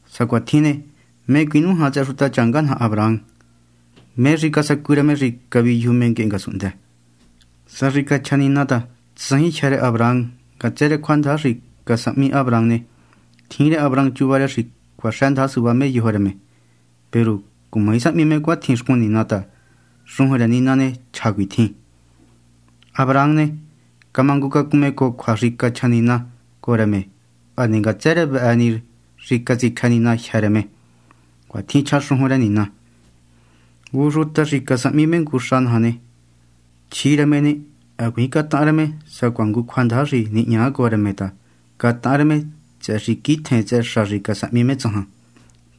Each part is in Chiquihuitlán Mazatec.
Sa cuatjin ne, ¿mé cuinújan tsëhë xutachanga naja Abraham? ¿Mé xi casacu rë me xi caviyuju me nguehe ngasunhndë? Sa xi cachja Nina ta tsajin jyë́ rë Abraham ngatsë rë cjuandaja xi casahmi Abraham ne, tjin rë Abraham chuva rë xi cuaxëndaja suvá me yojo rë me. Peru cumaji sahmi me cuatjin xcun Nina ta, xujun rë Nina ne, chja cuitjin: “Abraham ne, camangucacun me cojo cjua xi cachja Nina cojo rë me, hane ngatsë rë vëhë xi catsicjë Nina jyë́ rë me.” Cuatjin chja xujun rë Nina. Ngu xuta xi casahmi me ngu xa naja ne, chjí rë me ne, hacuiin catahan rë me sacuaha ngu cjuandaja xi nihña cojo rë me ta catahan rë me tsëhë xi quitjen tsëhë xa xi casahmi me tsajan.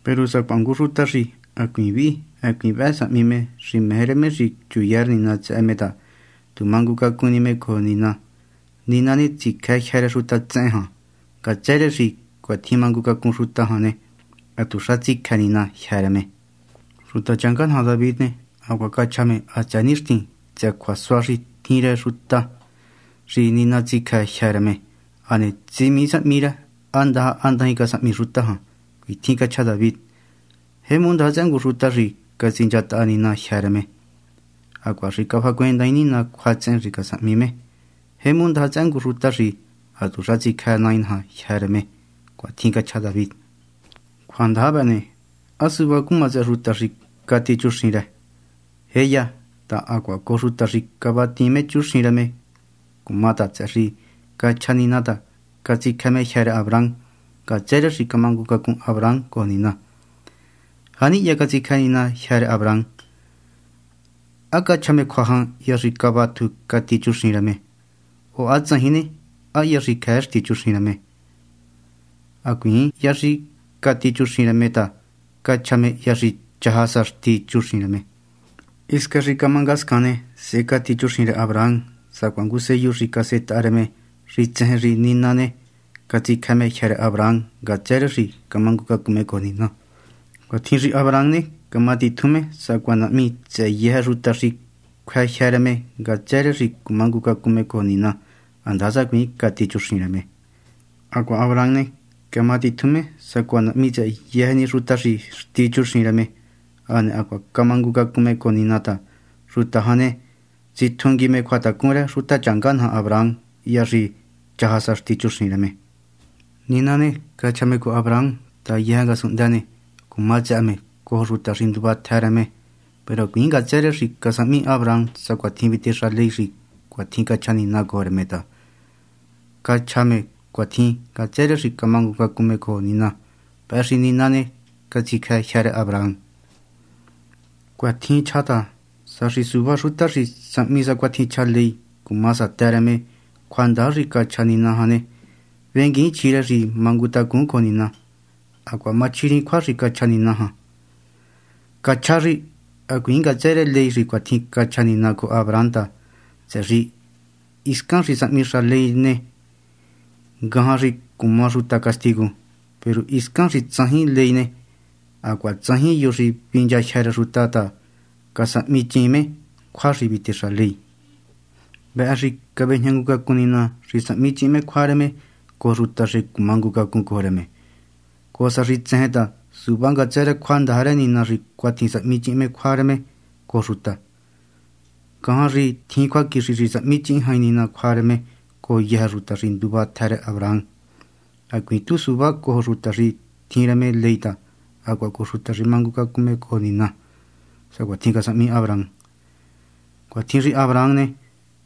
Peru sacuaha ngu xuta xi hacuiin vihi hacuiin vëhë sahmi me xi meje rë me xi chuya rë Nina tsëhë me ta tu mangucacun ni me cojo Nina, Nina tsicjë jyë́ rë xuta tsehen jan. Ngatsë rë xi cuatjin mangucacun xuta jan ne, hatuxa tsicjë Nina jyë́ rë me. Xutachanga naja David ne, hacuaha cachja me hatsëë nixtin tsëhë cjuasua xi tjin rë ngu xuta xi Nina tsicjë jyë́ rë me, hane tsimii sahmi rë há ndaja há ndajin casahmi xuta jan. Cuitjin cachja David: Jemu ndaja tsëhë ngu xuta xi catsinchataha Nina jyë́ rë me, hacuaha xi cafahacuendaain Nina cjuatsehen xi casahmi me. Jemu ndaja tsëhë ngu xuta xi hatuxa tsicjë Nai naja jyë́ rë me. Cuatjin cachja David. Cjuandaja vëhë ne, ¿há suvá cuma tsëhë xuta xi cati chuxin rë? ¡Jéya! ta, hacuaha cojo xuta xi vatiin me chuxin rë cuma ta, tsëhë xi ha cachjá ta Nina catsicjë me jyë́ rë Abraham ngatsë rë xi camangucacun Abraham cojo Nina. ¿Janihya catsicjë Nina jyë́ rë Abraham? ¿Há cachja me cjua jan hya xi cavatju cati chuxin rë me ne?, o há tsajin ne, ¿há hya xi cjëë xtí chuxin rë me? Hacuiin hya xi ha cati chuxin rë me ta cachja me hya xi chaja sa xtí. Hisca xi camá ngascan ne, sehe cati chuxin rë Abraham sacuaha ngu sellu xi casetaha rë me xi tsejen xi Nina ne, catsicjë me jyë́ rë Abraham ngatsë rë xi ha camangucacun me cojo Nina. Cuatjin xi Abraham ne, camatitjun me sacuaha nahmi tsëhë yëjë xuta xi cjuë jyë́ rë me ngatsë rë xi cumangucacun me cojo Nina handasa hacuiin xtí chuxin rë me. Hacuaha Abraham ne, camatitjun me sacuaha nahmi tsëhë yëjë ni xuta xi xtí chuxin rë me hane hacuaha cumangucacun me cojo Nina, ta xuta jan ne, vetjungui cjuatacun rë xutachanga naja Abraham hya xi chaja sa xtí chuxin rë me. Nina ne, cachja me cojo Abraham ta yëjë ngasunhndë ne, cuma tsëhë me cojo xuta xi nduva tjë rë me. Peru hacuiin ngatsë rë xi casahmi Abraham sacuatjin vitexa ley xi cuatjin cachja Nina cojo rë me ta cachja me cuatjin ngatsë rë xi camangucacun me cojo Nina. Vëhë xi Nina ne, catsicjë me jyë́ rë Abraham. Cuatjin chjá ta, sa xi suvá xuta xi sahmi sacuatjin chja ley cuma satë rë me cjuandaja xi cachja Nina jan ne, venguiin chjí rë xi mangutacun cojo Nina, hacuaha machjiriin cjua xi cachja Nina jan. Cachjá xi hacuiin ngatsë rë ley xi cuatjin cachja Nina cojo Abraham ta, tsëhë xi hiscan xi sahmixa ley rë Nina ne, ngajan xi cuma xuta castigu. Peru hiscan xi tsajin ley ne, hacuaha tsajin yo xi vinchajyë́ rë xuta ta casahmichiin me cjua xi vitexa ley. Vëhë xi cavejña ngu cacun Nina xi sahmichihin me cjua rë me cojo xuta xi cumangucacun cojo rë me, cojo sa xi tsejen ta suvá ngatsë rë cjuandaja rë Nina xi cuatjin sahmichihin me cjua rë me cojo xuta. Ngajan xi tjin cjuaquixi xi sahmichihin jain Nina cjua rë me cojo yëjë xuta xi nduva tjë rë Abraham, hacuiin tu suvá cojo xuta xi tjin rë me ley ta hacuaha cojo xuta xi mangucacun me cojo Nina, sacuatjin casahmi Abraham. Cuatjin xi Abraham ne,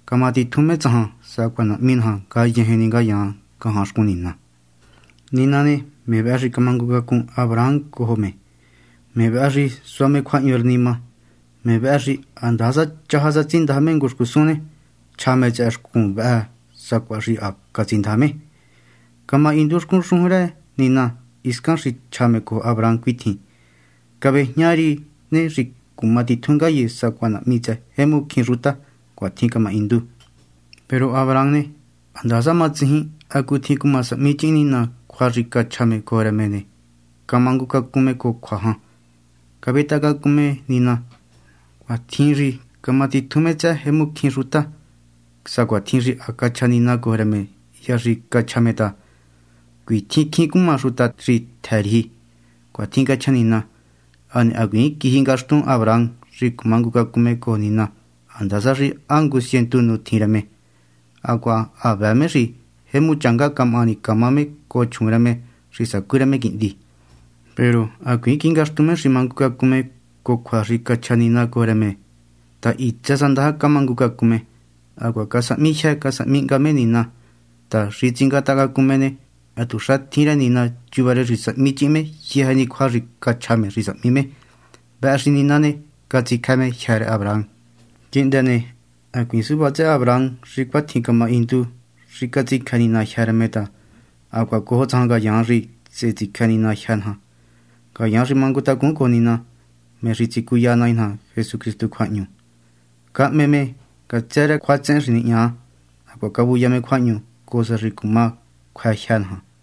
camatitjun me tsajan sacuaha nahmi naja ngayejen ni ngayaan ngajan xcun Nina. Nina ne, me vëhë xi camangucacun Abraham cojo me, me vëhë xi sua cjuahñu rë nima, me vëhë xi handasa chaja sa tsindaja me ngu xcusun ne, chja me tsëhë xcusun vëhë sacuaha xi ha catsindaja me. Camahindu xcun xujun rë Nina hiscan xi cachja me cojo Abraham cuitjin: “Cavejña ri ne, xi cuma titjun ngaye sacuaha nahmi tsëhë jemu cjín xuta.” Cuatjin camahindu. Peru Abraham ne, handasa matsijin hacutjin cuma sahmichihin Nina cjua xi cachja me cojo rë me ne, camangucacun me cojo cjua jan, cavetaha cacun me Nina. Cuatjin xi camatitjun me tsëhë jemu cjín xuta, sacuatjin xi ha cachja Nina cojo rë me hya xi cachja me ta: “Cuitjin cjín cuma xuta xi tjë riji.” Cuatjin cachja Nina. Hane hacuiin quiji ngaxtun Abraham xi mangucacun me cojo Nina handasa xi ha ngu cientu nu tjin rë me, hacuaha ha vëë me xi jemu changá camahani camá me cojo chjuun rë me xi sacú rë me quihndi. Peru hacuiin quiji ngaxtun me xi mangucacun me cojo cjua xi cachja Nina cojo rë me ta hitsë sa ndaja camangucacun me. Hacuaha casahmi jyë casahmi hnga me Nina ta, xi tsingatahacacun me ne, hatuxa tjin rë Nina chuva rë xi sahmi chihin me yëjë ni cjua xi cachja me xi sahmi me. Vëhë xi Nina ne, catsicjë me jyë́ rë Abraham. Quihndë ne, hacuiin suvá tsëhë Abraham xi cuatjin camahindu xi catsicjë Nina jyë́ rë me ta hacuaha cojo tsajan ngayaan, xi sehe tsicjë Nina jyë́ naja, ngayaan xi mangutacun cojo Nina, me xi catsicuya Nai naja Jesucristu cjuahñu. Cahme me ngatsë rë cjuatsehen xi nihña, hacuaha cavuya me cjuahñu cojo sa xi cuma cjuë jyë́ naja.